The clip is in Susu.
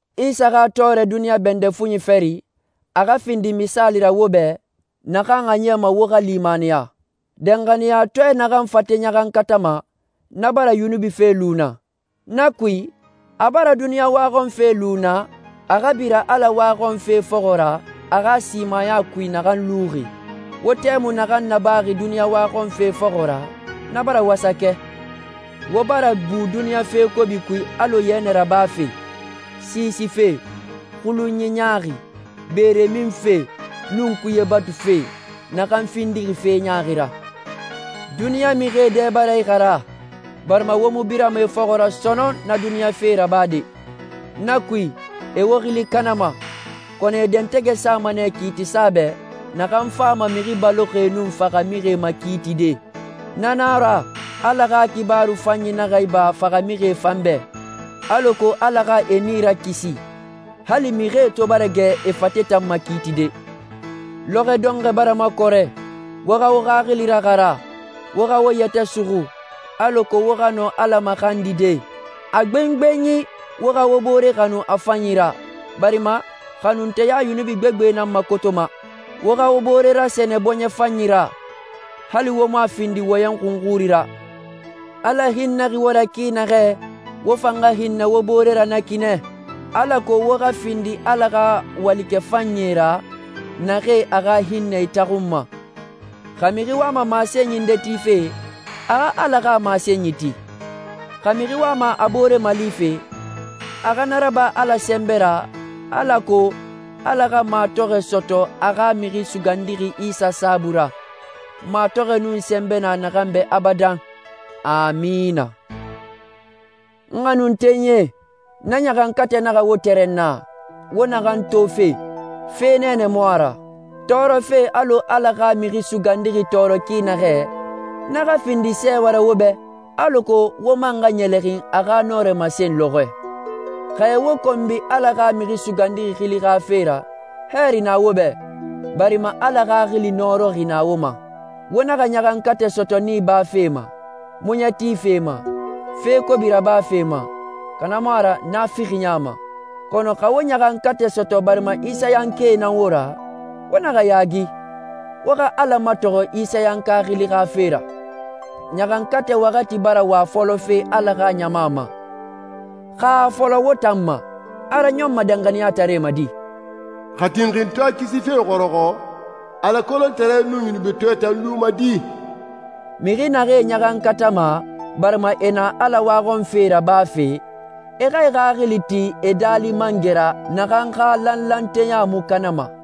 Isa xa tɔɔrɛ duniɲa bɛndɛ fuɲi fari, a xa findi misaali ra wo bɛ, naxan a niyama wo xa limaniya. Danxaniyatɔɛ naxan fate ɲaxankatama, na bara yunubi fe lu na. Na kui, a bara duniɲa waxɔnfe lu na, a xa bira Ala waxɔnfe fɔxɔ ra a xa simaya kui naxan luxi. Wo tɛmui naxan nabaxi duniɲa waxɔnfe fɔxɔ ra, na bara wasakɛ. Wo bara bu duniɲa fe kobi kui alɔ yɛnɛ rabafe, siisife, xulunyi ɲaaxi, beere minfe, nun kuye batufe, naxan findixi fe ɲaaxi ra. Duniɲa mixie dɛ bara ixara, barima wo mu birama e fɔxɔ ra sɔnɔn na duniɲa fee rabade. Na kui, e wo xili kanama, kɔnɔ e dɛntɛgɛ sama nɛ kiitisa bɛ, naxan fama mixi baloxie nun faxamixie makiitide. Na nan a ra, Ala xa xibaaru fanyi naxa iba faxamixie fan bɛ, alako Ala xa e nii rakisi, hali mixie to bara gɛ e fate tan makiitide. Lɔxɔ dɔnxɔɛ bara makɔrɛ. Wo xa wo xaxili raxara, wo xa wo yɛtɛ suxu, alako wo xa nɔ Ala maxandide. A gbengbenyi wo xa wo bore xanu a fanyi ra, barima xanunteya yunubi gbegbe nan makotoma. Wo xa wo bore rasɛnɛ bɔɲɛ fanyi ra, hali wo mu a findi wɔyɛn xunxuri ra. Ala hinnɛxi wo ra ki naxɛ, wo fan xa hinnɛ wo bore ra na ki nɛ, alako wo xa findi Ala xa walikɛ fanyie ra, naxee a xa hinnɛ itaxunma. Xa mixi wama masenyi nde tife, a xa Ala xa masenyi ti. Xa mixi wama a boore malife, a xa na raba Ala sɛnbɛ ra, alako Ala xa matɔxɔɛ sɔtɔ a xa Mixi Sugandixi Isa saabui ra. Matɔxɔɛ nun sɛnbɛ na a bɛ abadan. Amina. N xanuntenyie, na ɲaxankatɛ naxa wo tɛrɛnna, wo naxan tofe. Fe nɛɛnɛ mu a ra. Tɔɔrɔfe alɔ Ala xa Mixi Sugandixi tɔɔrɔ ki naxɛ, na xa findi sɛɛwɛ ra wo bɛ, alako wo man xa ɲɛlɛxin a xa nɔrɛ masen lɔxɔɛ. Xa e wo konbi Ala xa Mixi Sugandixi xili xa fe ra, hɛɛri na wo bɛ, barima Ala Xaxili nɔrɔxi na wo ma. Wo naxa ɲaxankatɛ sɔtɔ nii bafe ma, muɲɛ tife ma, fe kobi rabafe ma, xa na mu a ra naafixiya ma. Kɔnɔ xa wo ɲaxankatɛ sɔtɔ barima Isayankae nan wo ra, wo naxa yaagi, wo xa Ala matɔxɔ Isayanka xili xa fe ra. Ɲaxankatɛ waxati bara wa fɔlɔfe Ala xa ɲama ma. Xa a fɔlɔ won tan ma, a raɲɔnma danxaniyataree ma di? «Xa tinxintɔɛ kisife xɔrɔxɔ, Ala kolontare nun yunubitɔɛ tan luma di?» Mixi naxee ɲaxankatama, barima e na Ala waxɔnfe rabafe, e xa e xaxili ti e Daali Mangɛ ra naxan xa lanlanteya mu kanama.